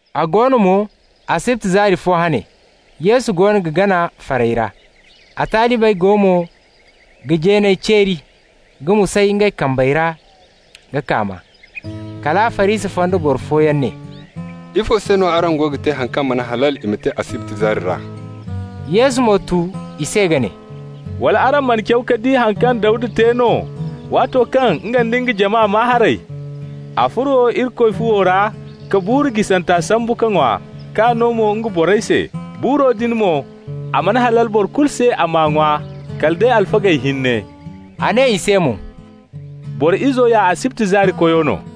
A go no mo, asibti zaari fo hane, Yesu goono ga gana farey ra. A talibey go mo ga jeeney ceeri ka musay ngey kambey ra ka kaama. Kala Farisi fonda boro fooyaŋ ne: «Ifo se no araŋ goono ga te haŋ kaŋ mana halal i ma te asibti zaari ra?» Yesu mo tu i se ka ne: «Wala araŋ mana caw ka di haŋ kaŋ Dawda te no, waato kaŋ nga nda nga jama maa haray? A furo Irikoy fuwo ra ka buuru jisanta sambu ka ŋwa, k'a no mo nga borey se. Buuro din mo, a mana halal boro kulu se a m'a ŋwa, kala day alfagey hinne.» A ne i se mo: «Boro Izo ya asibti zaari Koyo no.»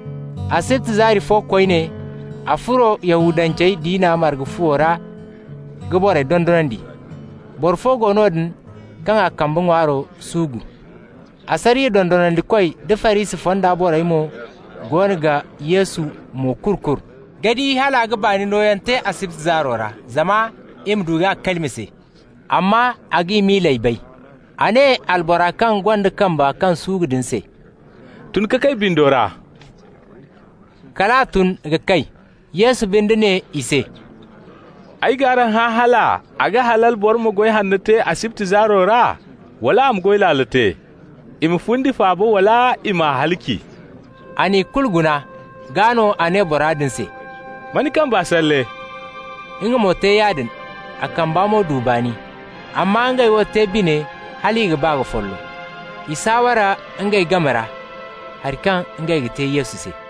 Asibti zaari fo koyne, a furo Yahudance diina marga fuwo ra ka borey dondonandi. Boro fo go noodin kaŋ a kambe ŋwaaro suugu. Asariya dondonandikoy da Farisi fonda borey mo goono ga Yesu mo-kuru-kuru ka di hal a ga baani nooyaŋ te asibti zaaro ra, zama i ma du k'a kalima se. Amma a g'i miiley bay. A ne albora kaŋ gonda kambe kaŋ suugu din se: «Tun ka kay bindo ra.» Kal a tun ka kay. Yesu binde ne i se: «Ay g'araŋ hã hal a ga halal boro ma goy hanno te asibti zaaro ra, wala a ma goy laalo te? I ma fundi faaba wala i m'a halaci?» A n'i kulu guna, gaa no a ne bora din se: «Ma ni kamba salle.» Nga mo te yaadin, a kamba mo du baani. Amma ngey wo te bine hal i ga ba ka follo. I saaware ngey game ra haŋ kaŋ ngey ga te Yesu se.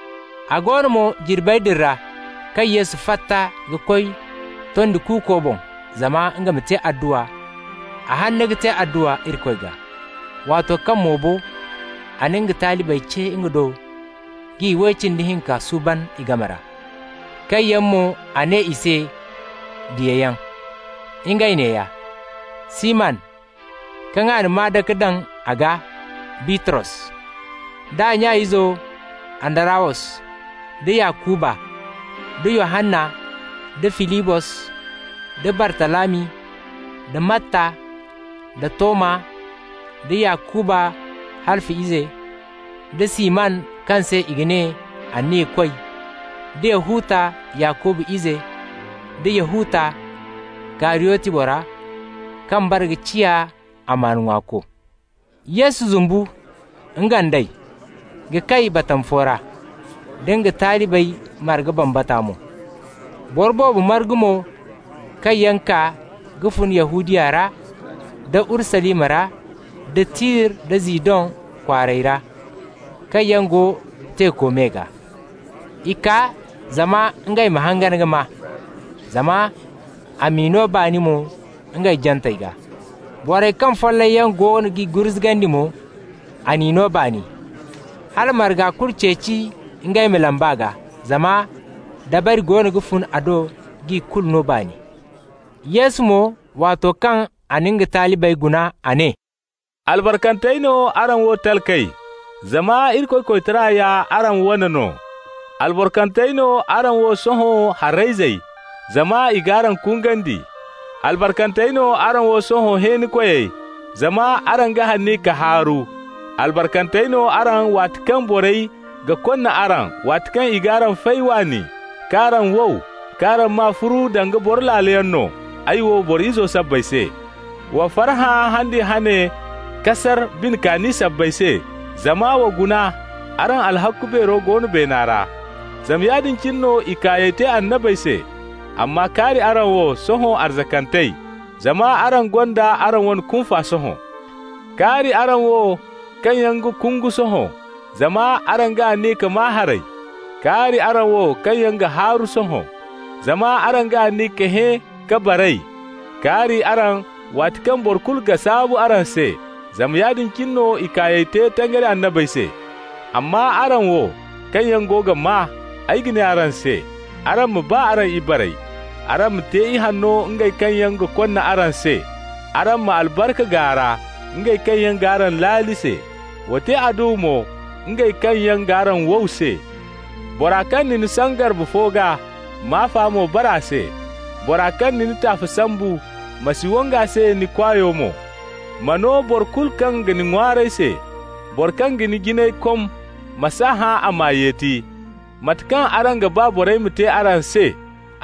A go no mo, jirbey din ra, kaŋ Yesu fatta ka koy tondi kuuko boŋ zama nga ma te adduwa, a hanna ka te adduwa Irikoy gaa. Waato kaŋ mo bo, a na nga talibey ce nga do ka iway cindi hinka suuban i game ra, kaŋ yaŋ mo a ne i se diyayaŋ. Ngey neeya: Siman, kaŋ a na maa-dake daŋ a gaa Bitros, d'a nya ize Andarawos, da Yakuba, da Yohanna, da Filibos, da Bartalami, da Matta, da Toma, da Yakuba Halfa ize, da Siman kaŋ se i ga ne Anniyakoy, da Yahuta Yakuba ize, da Yahuta, Kariyoti bora, kaŋ bare ka ciya amaana ŋwaako. Yesu zumbu, nga nd'ey, ka kay batama fo ra, da nga talibey marga bambata mo. Boro boobo margu mo kaŋ yaŋ kaa ka fun Yahudiya ra, da Urusalima ra, da Tir da Zidon kwaarey ra, kaŋ yaŋ go teeko me gaa. I kaa zama ngey ma hangan ka maa, zama a m'i no baani mo ngey jantey gaa. Borey kaŋ follayyaŋ goono g'i gurzugandi mo, a n'i no baani. Hala marga kulu ceeci ngey ma lamb'a gaa, zama dabari goono ga fun a do k'i kulu no baani. Yesu mo, waato kaŋ a na nga talibey guna, a ne: «Albarkantey no araŋ wo talkey, Zama Irikoy koytara ya araŋ wane no. Albarkantey no araŋ wo sohõ harayzey, Zama i g'araŋ kungandi. Albarkantey no araŋ wo sohõ hẽenikoyey, Zama araŋ ga aniya ka haaru. Albarkantey no araŋ waati kaŋ borey ga konna araŋ, waati kaŋ i g'araŋ fay waani, K'araŋ wow, k'araŋ maa furu danga boro laaloyaŋ no, Ay wo, Boro Izo sabbay se. Wa farhã han din hane ka sar bine kaani sabbay se, zama wa guna, araŋ alhakku beero go no beena ra. Zama yaadin cine no i kaayey te annabey se. Amma kaari araŋ wo, sohõ arzakantey! Zama araŋ gonda araŋ wane kunfa sohõ. Kaari araŋ wo kaŋ yaŋ ga kungu sohõ! Zama araŋ ga aniya ka maa haray. Kaari araŋ wo kaŋ yaŋ ga haaru sohõ! Zama araŋ ga aniya ka hẽ ka baray. Kaari araŋ waati kaŋ boro kulu ga saabu araŋ se! Zama yaadin cine no i kaayey te tangari annabey se. Amma araŋ wo kaŋ yaŋ go ga maa, ay ga ne araŋ se: araŋ ma ba araŋ ibarey. Araŋ ma te ihanno ngey kaŋ yaŋ ga konna araŋ se. Araŋ ma albarka gaara ngey kaŋ yaŋ g'araŋ laali se. Wa te adduwa mo ngey kaŋ yaŋ g'araŋ wow se. Bora kaŋ na ni saŋ garbe fo gaa, m'afa mo bare a se. Bora kaŋ ga ni taafe sambu, ma si wang'a se ni kwaayo mo. Ma no boro kulu kaŋ ga ni ŋwaaray se. Bora kaŋ ga ni jinayey kom, ma s'a hã a m'a yeti. Mate kaŋ araŋ ga ba borey ma te araŋ se,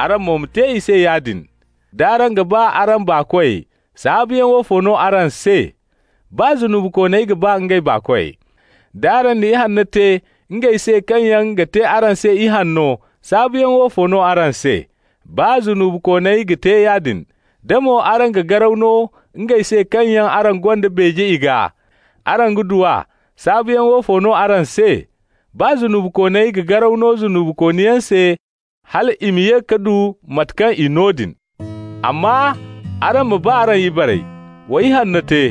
araŋ mo ma te i se yaadin. D'araŋ ga ba araŋ baakoy, saabuyaŋ woofo no araŋ se? Baa zunubikooney ga ba ngey baakoy. D'araŋ na ihanno te ngey se kaŋ yaŋ ga te araŋ se ihanno, saabuyaŋ woofo no araŋ se? Baa zunubikooney ga te yaadin. Da mo araŋ ga garaw no ngey se kaŋ yaŋ araŋ gonda beeje i gaa araŋ ga du a, saabuyaŋ woofo no araŋ se? Baa zunubikooney ga garaw no zunubikooniyaŋ se hal i ma ye ka du mate kaŋ i no din. Amma araŋ ma ba araŋ ibarey. Wa ihanno te.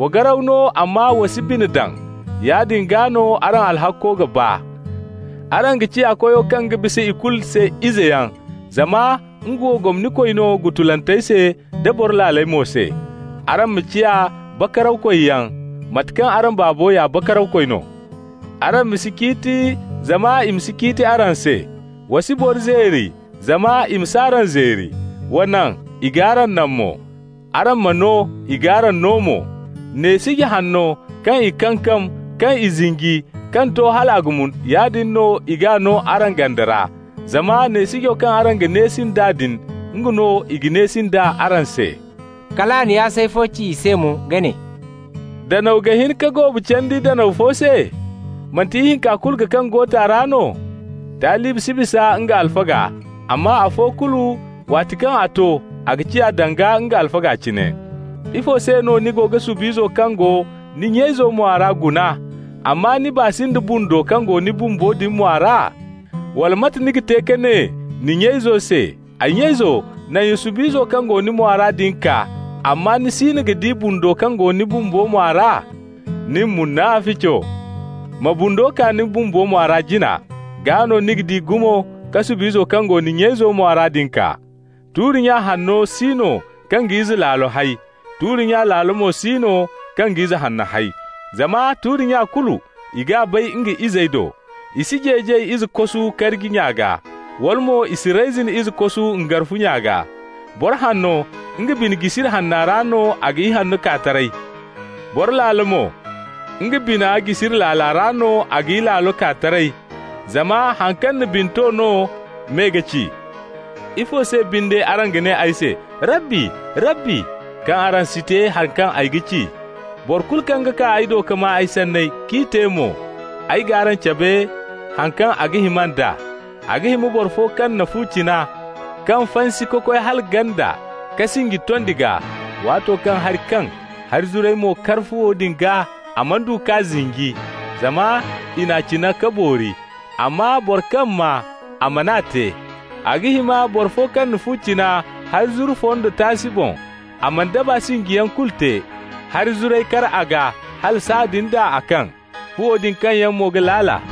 Wa garaw no amma wa si bine daŋ. Yaadin gaa no araŋ alhakko ga baa. Araŋ ga ciya Koyo kaŋ ga bisa ikulu se izeyaŋ, zama nga wo gomnikoy no gutulantey se da boro laaley mo se. Araŋ ma ciya bakarawkoyyaŋ, mate kaŋ araŋ Baabo ya Bakarawkoy no. Araŋ ma si ciiti, zama i ma si ciiti araŋ se. Wa si boro zeeri, zama i ma s'araŋ zeeri. Wa naŋ, i g'araŋ naŋ mo. Araŋ ma no, i g'araŋ no mo. Neesiji hanno, kaŋ i kankam, kaŋ i zinji, kaŋ to hal a ga mun, yaadin no i g'a no araŋ ganda ra. Zama neesijo kaŋ araŋ ga neesi nd'a din, nga no i ga neesi nd'a araŋ se.» Kal a na yaasay fo ci i se mo ka ne: «Danaw ga hin ka goobu candi danaw fo se? Manti ihinka kulu ga kaŋ goota ra no? Talibi si bisa nga alfaga, amma afo kulu, waati kaŋ a to, a ga ciya danga nga alfaga cine. Ifo se no ni ga sub'izo kaŋ go ni nya-izo mwa ra guna, amma ni baa si nda bundo kaŋ go ni bumbo din mwa ra? Wala mate ni ga te ka ne ni nya-izo se: ‹Ay nya-izo, naŋ ya sub'izo kaŋ go ni mwa ra din kaa,› amma ni siino ga di bundo kaŋ go ni bumbo mwa ra? Nin, munafico! Ma bundo kaa ni bumbo mwa ra jina, gaa no ni ga di gumo ka sub'izo kaŋ go ni nya-izo mwa ra din kaa. Tuuri-nya hanno si no kaŋ ga ize laalo hay, tuuri-nya laalo mo si no kaŋ ga ize hanno hay. Zama tuuri-nya kulu, i g'a bay nga izey do. I si jeejay ize kosu karji nya gaa, wala mo i si reyzin ize kosu ngarfu nya gaa. Boro hanno, nga bina jisiri hanna ra no a ga ihanno kaa taray. Boro laalo mo, nga bina jisiri laala ra no a ga ilaalo kaa taray. Zama haŋ kaŋ na bine to no me ga ci. Ifo se binde araŋ ga ne ay se: ‹Rabbi, Rabbi,› kaŋ araŋ si te hari kaŋ ay ga ci? Boro kulu kaŋ ga kaa ay do ka maa ay sanney, k'i te mo, ay g'araŋ cabe haŋ kaŋ a ga hima nd'a. A ga hima boro fo kaŋ na fu cina, kaŋ fansi ka koy hala ganda ka sinji tondi gaa. Waato kaŋ hari kaŋ, hari zuray mo kar fuwo din gaa, a mana du k'a zinji, zama i n'a cina ka boori. Amma boro kaŋ maa, a man'a te, a ga hima boro fo kaŋ na fu cina hari zuru fondo taasi boŋ, a mana daba sinjiyaŋ kulu te. Hari zuray kar a gaa, hala sahãadin d'a a kaŋ. Fuwo din kaŋyaŋ mo ga laala.»